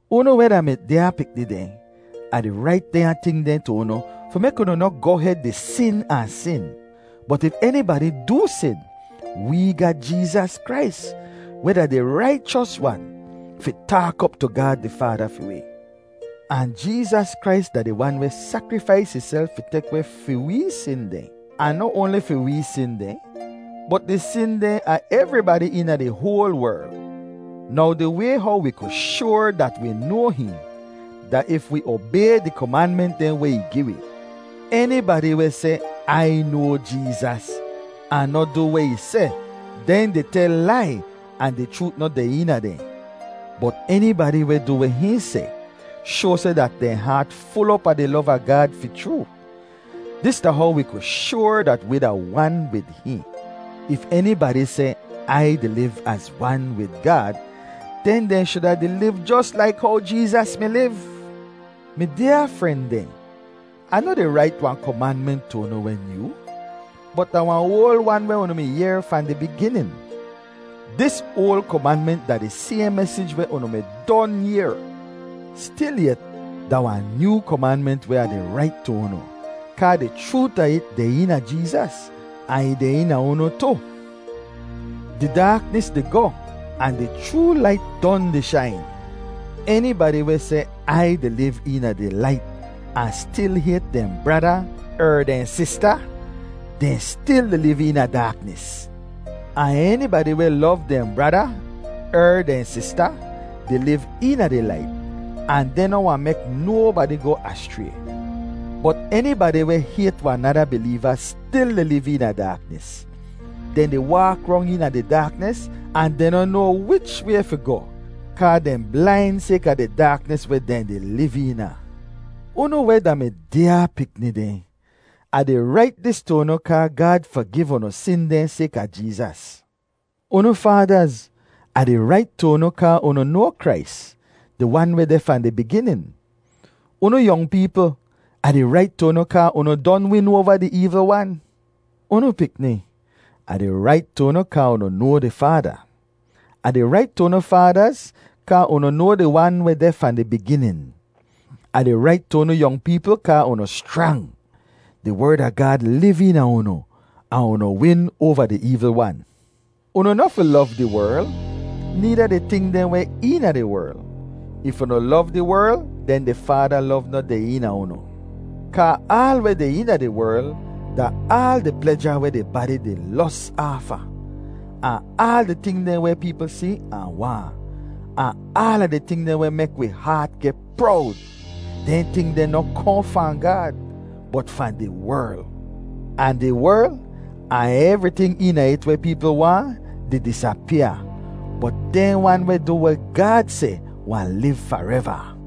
Unu weh da mi dyaa pikni dehn, Ah di rait dehnya ting dehn tu unu fi mek unu noh goh hed di sin ahn sin. Bot if enibadi doo sin, wee ga Jeezas Krais, weh da di Raichos Wan, fi taak op tu Gaad di Faada fi wi. Ahn Jeezas Krais da di Wan weh sakrifais ihself fi tek weh fi wee sin dehn, ahn noh oanli fi wee sin dehn, bot di sin dehn a evribadi eena di hoal werl. Now di way how wi ku shoar dat wi noa hihn, da if wi obay di komanment dehn weh ih gi wi. Enibadi weh seh, “Ai noa Jeezas,” ahn noh du weh ih seh, dehn di tel lai ahn di chroot noh deh eena dehn. Bot enibadi weh du weh hihn seh, shoa seh dat dehn haat ful op a di lov a Gaad fi chroo. Dis da how wi ku shoar dat wi da wan wid hihn: If enibadi seh, “Ai di liv az wan wid Gaad,” den dehn shuda di liv jos laik how Jeezas mi liv. Mi dyaa fren dehn, Ah noh di rait wahn komanment tu unu weh nyoo, bot da wahn oal wan weh unu mi yehr fahn di biginin. Dis oal komanment da di sayhn mesij weh unu mi don yehr. Stilyet, da wahn nyoo komanment weh Ah di rait tu unu, kaa di chroot a it deh eena Jeezas ahn ih deh eena unu tu. Di daaknis di goh ahn di chroo lait don di shain. Enibadi weh seh, “Ai di liv eena di lait,” ahn stil hayt dehn brada er dehn sista, dehn stil di liv eena daaknis. Ahn enibadi weh lov dehn brada er dehn sista, di liv eena di lait, ahn dehn noh wahn mek nobadi goh aschray. Bot enibadi weh hayt wahn nada bileeva stil di liv eena daaknis. Dehn di waak rong eena di daaknis ahn dehn noh noa wich way fi goh kaa dehn blain sayka di daaknis weh dehn di liv eena. Unu weh da mi dyaa pikni dehn, Ah di rait dis tu unu kaa Gaad fagiv unu sin dehn sayka Jeezas. Unu faadaz, Ah di rait tu unu kaa unu noa Krais, di Wan weh deh fahn di biginin. Unu yong peepl, Ah di rait tu unu kaa unu don win oava di eevl wan. Unu pikni, Ah di rait tu unu kaa unu noa di Faada. Ah di rait tu unu faadaz kaa unu noa di Wan weh deh fahn di biginin. Ah di rait tu unu yong peepl kaa unu schrang; di Werd a Gaad liv eena unu, ahn unu win oava di eevl wan. Unu noh fi lov di werl, needa di ting dehn weh eena di werl. If unu lov di werl, den di Faada lov noh deh eena unu. Kaa aal weh deh eena di werl da aal di pleja weh di badi di los aafa, ahn aal di ting dehn weh peepl si ahn waahn, ahn aala di ting dehn weh mek wi haat geh prowd. Dehn ting deh noh kohn fahn Gaad, bot fahn di werl. Ahn di werl, ahn evriting eena it weh peepl waahn, di disapyaa, bot dehn wan weh du weh Gaad seh wahn liv fareva.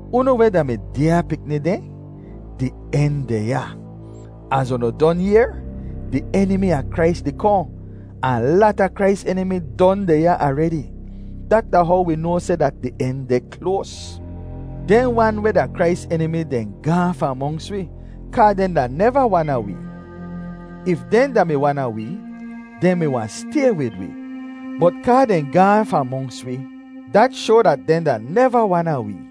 Unu weh da mi dyaa pikni dehn, di en deh ya. Az unu don yehr, di Enimi a Krais di kohn, ahn lata Krais enimi don deh ya aredi. Dat da how wi noa seh dat di en deh kloas. Dehn wan weh da Krais enimi dehn gaahn fahn monks wi kaa dehn da neva wan a wee. If dehn da-mi wan a wee, dehn mi wahn stay wid wi. Bot kaa dehn gaahn fahn monks wi, dat shoa dat dehn da neva wan a wee.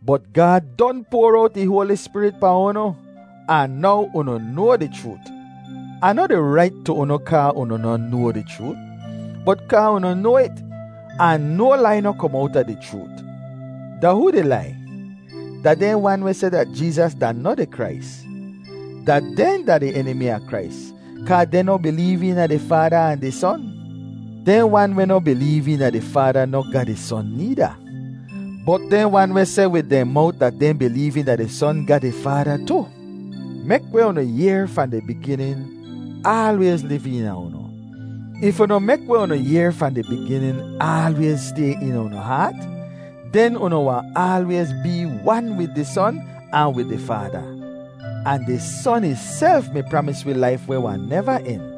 Bot Gaad don poar owt ih Hoali Spirit pahn unu, ahn now unu noa di chroot. Ah noh di rait tu unu kaa unu noh noa di chroot, bot kaa unu noa it, ahn no lai noh kom owta di chroot. Da hoo di lai? Da dehn wan weh seh dat Jeezas da noh di Krais. Da dehn da di Enimi a Krais, kaa dehn noh bileev eena di Faada ahn di Son. Dehn wan weh noh bileev eena di Faada noh ga di Son needa. Bot dehn wan weh seh wid dehn mowt dat dehn bileev eena di Son ga di Faada tu. Mek weh unu yehr fahn di biginin aalwayz liv eena unu. If unu mek weh unu yehr fahn di biginin aalwayz stay eena unu haat, den unu wahn aalwayz bee wan wid di Son ahn wid di Faada. Ahn di Son ihself mi pramis wi laif weh wahn neva en.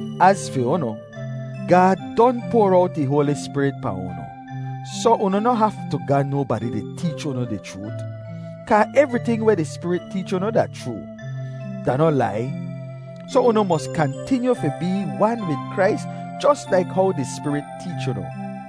Az fi unu, Gaad don poar owt ih Hoali Spirit pahn unu, soh unu noh haftu ga nobadi di teech unu di chroot. Kaa evriting weh di Spirit teech unu da chroo; da noh lai. Soh unu mos kantinyu fi bee wan wid Krais jos laik how di Spirit teech unu.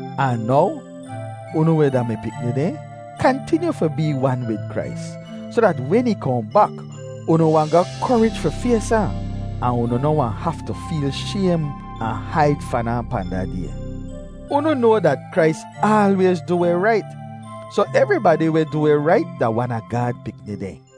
Ahn now, unu weh da mi pikni dehn, kantinyu fi bee wan wid Krais, soh dat wen ih kohn bak, unu wahn ga korij fi fays ahn, ahn unu noh wahn haftu feel shaym ahn haid fahn ahn pahn da Day. Unu noa dat Krais aalwayz du weh rait, soh evribadi weh du weh rait da wan a Gaad pikni dehn.